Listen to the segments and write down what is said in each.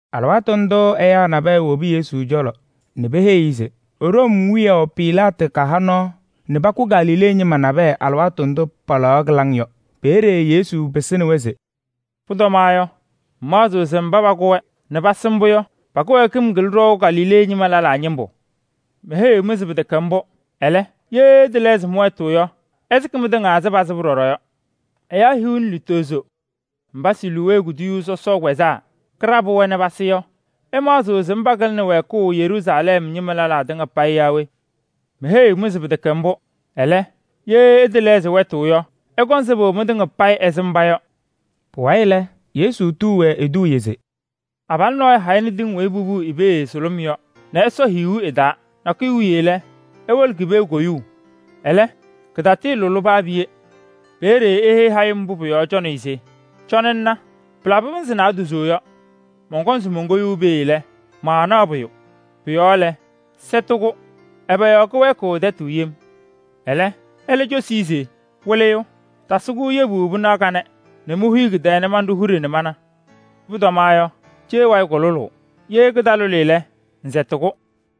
Alɩwaatʋ ndʋʋ ɛyaa nabɛyɛ wobi Yesu cɔlɔ nɛ peheyi-i se Room wiyaʋ Pilaatɩ kaha nɔɔ nɛ pakʋ Galilee ñɩma nabɛyɛ alɩwaatʋ ndʋ palaɣaɣ kɩlaŋ yɔ. Peeye Yesu pɩsɩnɩ-wɛ se: “Pʋtɔmaɣ yɔ, ɩmaɣzɩɣ se mba pakʋ-wɛ nɛ pasɩ mbʋ yɔ, pa-kɩwɛɛkɩm kɩlɩnɩ ɖɔʋ Galilee ñɩma lɛlaa ñɩmbʋ. Meheyiɣ-mɩ se pɩtɛkɛ mbʋ. Ɛlɛ, ye ɩtɛlɛɣzɩ wɛtʋ yɔ, ɩsɩkɩ mɩtɩŋa ɛzɩ pasɩbʋ ɖɔɖɔ yɔ. Ɛyaa hiu nɛ lutozo mba Siloowee kuduyuu sɔsɔʋ kpɛzaa kɩɖabɩ-wɛ nɛ pasɩ yɔ, ɩmaɣzɩɣ se mba kɩlɩnɩ wɛɛkʋʋ Yeruusalɛm ñɩma lɛlaa tɩŋa payɩ yaa we? Meheyiɣ-mɩ se pɩtɛkɛ mbʋ. Ɛlɛ, ye ɩtɛlɛɣzɩ wɛtʋ yɔ, ɩkɔŋ sɩbʋ mɩtɩŋa payɩ ɛzɩ mba yɔ.” Pʋwayɩ lɛ, Yesu tuu-wɛ eduuye se: “Abalʋ nɔɔyʋ hayɩnɩ tɩŋ weyi popuu i-pee sʋlʋm yɔ nɛ ɛsɔ hiyuu ɩ-taa. Nakʋyʋ wiye lɛ, ewolo ki-pee koyuu. Ɛlɛ, kɩtatɩɩlʋlɩ paa piye. Peeye eheyi hayɩm mbʋ pʋ-yɔɔ cɔnɩyʋ se: ‘Cɔnɩ ŋna, pɩlabɩ pɩnzɩ naadozo yɔ, mɔnkɔŋ se monkoyuu pee lɛ, maanaɣ pʋyʋ. Pʋ-yɔɔ lɛ, sɛtɩ-kʋ. Ɛbɛ yɔɔ kʋwɛɛkɩɣ tɛtʋ yem.’ Ɛlɛ, ɛlɛ cosi-i se: ‘Wɩlɩyʋ! Tasɩ-kʋ yebu pɩnaɣ kanɛ nɛ mohuyi kɩ-tɛɛ nɛ manɖʋ huɖe nɛ mana. Pʋtɔmaɣ yɔ, cee wayɩ kʋlʋlʋʋ. Ye kɩtalʋlɩ lɛ, ŋsɛtɩ-kʋ.’”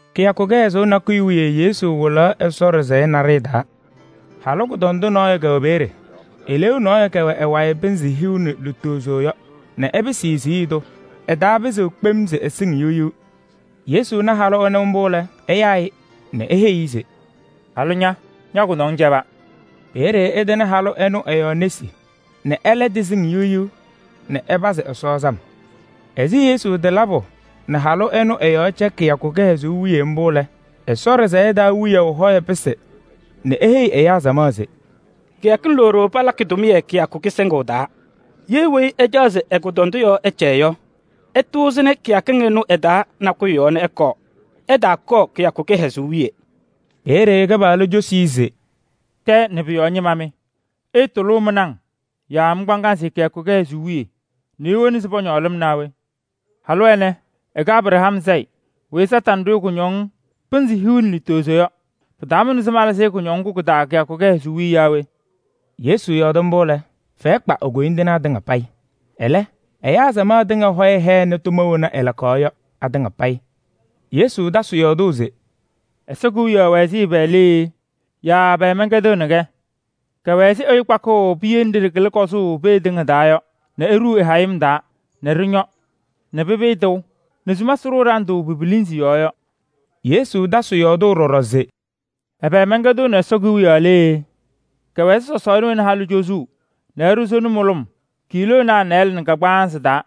Kɩyakʋ kɩhɛzʋʋ nakʋyʋ wiye Yesu wɩlaɣ Ɛsɔ ɖɩsɛyɛ naɖɩyɛ taa. Halʋ kʋdɔndʋ nɔɔyʋ kɛwɛ peeye. Eleeu nɔɔyʋ kɛwɛ ɛ-wayɩ pɩnzɩ hiu nɛ lutozo yɔ nɛ ɛpɩsɩ-ɩ siɣye tʋ. Ɛtaapɩzɩɣ kpem se ɛsɩŋ yiɣ yiɣ. Yesu na halʋ ɛnʋ mbʋ lɛ, ɛyaa-ɩ nɛ eheyi-i se: “Halʋ ña! Ña-kʋdɔŋ cɛba.” Peeye ɛtɩnɩ halʋ ɛnʋ ɛ-yɔɔ nesi nɛ ɛlɛ tɩsɩŋ yiɣ yiɣ nɛ ɛpazɩ Ɛsɔ sam. Ɛzɩ Yesu tɩɩlabʋ nɛ halʋ ɛnʋ ɛ-yɔɔ cɛ kɩyakʋ kɩhɛzʋʋ wiye mbʋ yɔ lɛ, Ɛsɔ ɖɩsɛyɛ taa wiyaʋ hɔyɛ pɩsɩ nɛ eheyi ɛyaa samaɣ se: “Kɩyakɩŋ loɖo palakɩ tʋmɩyɛ kɩyakʋ kɩsɩŋʋʋ taa. Ye weyi ɛcaɣ se ɛ-kʋdɔndʋ yɔɔ ɛcɛ yɔ, ɛtʋʋzɩnɩ kɩyakɩŋ ɩnʋ ɩ-taa nakʋyʋ nɛ ɛkɔɔ. Ɛtaakɔɔ kɩyakʋ kɩhɛzʋʋ wiye.” Peeye Kɩpaɣlʋ cosi-i se: “Tɛɛ nɛ pʋ-yɔɔ ñɩma mɩ! Ɩɩtʋlʋʋ mɩ-naŋ yaa mɩ-kpaŋasɩ kɩyakʋ kɩhɛzʋʋ wiye nɛ iwona se pɔñɔɔ lɩm naa we? Halʋ ɛnɛ, ɛkɛ Abraham sayɩ weyi Kañadʋ Satanɩ ɖʋ-ɩ kʋñɔŋ pɩnzɩ hiu nɛ lutozo yɔ. Pɩtaamʋnɩ se malɩzɩ-ɩ kʋñɔŋ ŋgʋ kɩ-taa kɩyakʋ kɩhɛzʋʋ wiye yaa we?” Yesu yɔɔdɩ mbʋ lɛ, fɛyɛ kpa e-koyindinaa tɩŋa payɩ. Ɛlɛ, ɛyaa samaɣ tɩŋa laŋɩyɛ hɛnɩ tʋma wena ɛlakaɣ yɔ atɩŋa payɩ. Yesu tasɩ yɔɔdʋʋ se: “Ɛsɔ Kewiyaɣ wɛ ɛzɩ ɛbɛ lee? Yaa ɛbɛ mɛnkɛdɩɣnɩ-kɛ? Kɛwɛ ɛzɩ ɛyʋ kpakʋʋ piye nɖɩ ɖɩkɩlɩ kɔzʋʋ pee tɩŋa taa yɔ nɛ eɖuu ɛ-hayɩm taa nɛ ɖɩñɔ nɛ pɩpɩɩ tɩʋ nɛ sumasɩ ɖʋʋ ɖandʋ ki-pilinzi yɔɔ yɔ.” Yesu tasɩ yɔɔdʋʋ ɖɔɖɔ se: “Ɛbɛ mɛnkɛdɩɣnɩ Ɛsɔ Kewiyaɣ lee? Kɛwɛ ɛzɩ sɔsɔɔna wena halʋ cozuu nɛ ɛɖʋ sona mʋlʋm kiiloonaa nɩɩlɛ nɛ kagbaanzɩ taa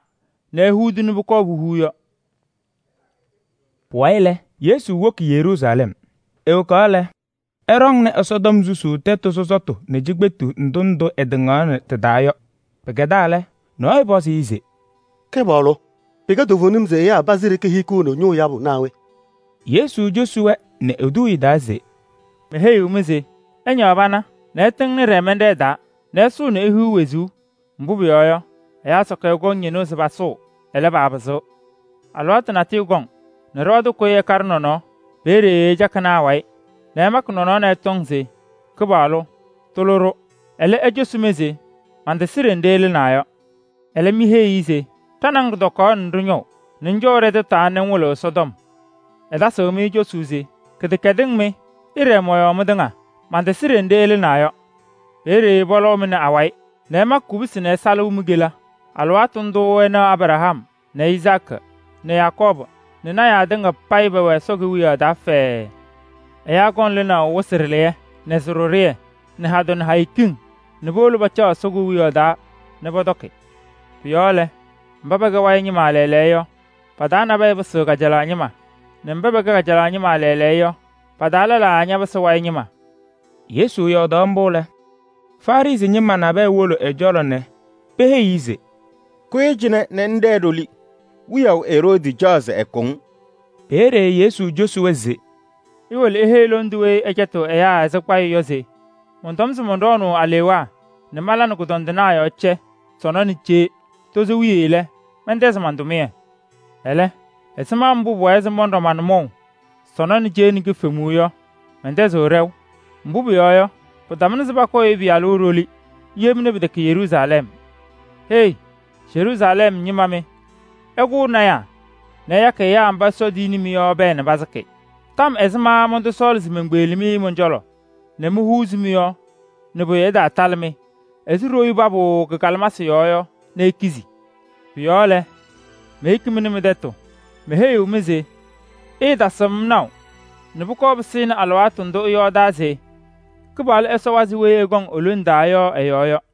nɛ ehuudi nɛ pʋkɔɔ puhuu yɔ.” Pʋwayɩ lɛ, Yesu woki Yeruusalɛm. Ewokaɣ lɛ, ɛɖɔŋnɩ Ɛsɔtɔm susuu tɛtʋ sɔsɔtʋ nɛ cikpetu ndʋ ndʋ ɛtɩŋaɣnɩ tɩ-taa yɔ pa-taa. Pɩkɛdaa lɛ, nɔɔyʋ pɔzɩ-ɩ se: “Kɩpaɣlʋ! Pɩkɛ toovenim se ɛyaa pazɩ ɖeke hikiɣni ñʋʋ yabʋ naa we?” Yesu cosi-wɛ nɛ eduuye taa se: “Meheyiɣ-mɩ se: ɩñaɣ pana nɛ ɩtɩŋnɩ ɖɛɛmɛnɖɛɛ taa nɛ ɩsʋʋ nɛ ihiɣ wezuu. Mbʋ pʋyɔɔ yɔ, ɛyaa sakɩyɛ kɔŋ ñɩnʋʋ se pasʋʋ, ɛlɛ, paapɩzɩɣ. Alɩwaatʋ natʋyʋ kɔŋ nɛ ɖɩɣa tʋ kʋyɩ ɛkaɖɩ nɔnɔɔ. Peeye ɩcakɩnɩ awayɩ nɛ ɩmakɩ nɔnɔɔ nɛ ɩtɔŋ se: ‘Kɩpaɣlʋ! Tʋlɩ-ɖʋ!’ Ɛlɛ, ecosuu-mɩ se: ‘Mantasɩ ɖenɖe ɩlɩnaa yɔ.’ Ɛlɛ, miheyi-i se: ‘Ɖa nɛ ŋ ɖɩtɔkaɣna nɛ ɖɩñɔʋ nɛ ŋcɔʋ ɖɛ-tɛtʋ taa nɛ ŋwɩlɩɣ Ɛsɔtɔm.’ Ɛtasɩɣ-mɩ cosuu se: ‘Kɩdɛkɛdɩŋ mɩ! Ɩɖɛɛ mɔ-yɔɔ mɩtɩŋa. Mantasɩ ɖenɖe ɩlɩnaa yɔ.’ Peeye pɔlɔʋ-mɩ nɛ awayɩ nɛ ɩma kubusi nɛ ɩsalɩ mi-kela. Alɩwaatʋ ndʋʋ ɩnaɣ Abraham nɛ Izaakɩ nɛ Yakɔɔbʋ nɛ lɔɔyɩsɩ tɩnaa tɩŋa payɩ pɛwɛ Ɛsɔ Kewiyaɣ taa fɛɛɛ. Ɛyaa kɔŋ lɩnaʋ wɩsɩ ɖɩlɩyɛ nɛ sɩ-ɖɩɖʋyɛ nɛ hadɛ nɛ hayo kiŋ nɛ powolo pacaɣ Ɛsɔ Kewiyaɣ taa nɛ pɔtɔkɩ. Pʋ-yɔɔ lɛ, mba pɛkɛ wayɩ ñɩma lɛɛlɛɛyɔ yɔ, pa-taa nabɛyɛ pɩsɩɣ kajalaɣ ñɩma nɛ mba paba kɛ kajalaɣ ñɩma lɛɛlɛɛyɔ yɔ, pa-taa lɛlaa ñapɩsɩ wayɩ ñɩma.” Yesu yɔɔdaɣ mbʋ lɛ, Farɩsɩ ñɩma nabɛyɛ wolo ɛ-cɔlɔ nɛ peheyi-i se: “Kʋyɩ cɩnɛ nɛ ŋɖɛɛ ɖoli. Wiyaʋ Eroodi caɣ se ɛkʋ-ŋ.” Peeye Yesu cosi-wɛ se: “Iwolo iheyi aji lɔŋ tʋ ɛnʋ se mɔnɖɔɔnʋʋ alewaa nɛ mala nɛ kʋdɔndɩnaa yɔɔ cɛ sɔnɔ nɛ cee. Tozo wiye lɛ, mɛntɛzɩ man-tʋmɩyɛ. Ɛlɛ, ɛzɩma mbʋ pʋwɛɛ se mɔnɖɔ ma-nʋmɔʋ sɔnɔ nɛ cee nɛ ki-kifemuu yɔ, mɛntɛzɩɣ ɖɛʋ. Mbʋ pʋyɔɔ yɔ, pɩtamʋnɩ se pakʋ lɔɔyaɣ tʋ ɖoli yem nɛ pɩtɛkɛnɩ Yeruusalɛm. Hei! Yeruusalɛm ñɩma mɩ, ɩkʋʋ lɔɔyɩsɩ tɩnaa nɛ ɩyakɩ ɛyaa mba Ɛsɔ tiyini-mɩ yɔ pɛɛ nɛ pasɩkɩ. Tɔm ɛzɩma mɔntɔsɔɔlɩ se menkpeɣli-mɩ mɔn-cɔlɔ nɛ mohuuzi mɩ-yɔɔ nɛ pʋyʋ ɛtaalabɩ-mɩ ɛzɩ ɖoyuu pabʋʋ kɩ-kalɩmasɩ yɔɔ yɔ nɛ ikizi? Pʋ-yɔɔ lɛ, meyeki-mɩ nɛ mɩ-tɛtʋ. Meheyiɣ-mɩ se: ɩɩtasɩɣ-m naʋ nɛ pʋkɔɔ pɩsɩnɩ alɩwaatʋ ndʋ ɩyɔɔdaa se: ‘Kɩpaɣlʋ Ɛsɔ ɛwazɩ weyi ɛkɔŋ e-lone taa yɔ ɛ-yɔɔ yɔ.’”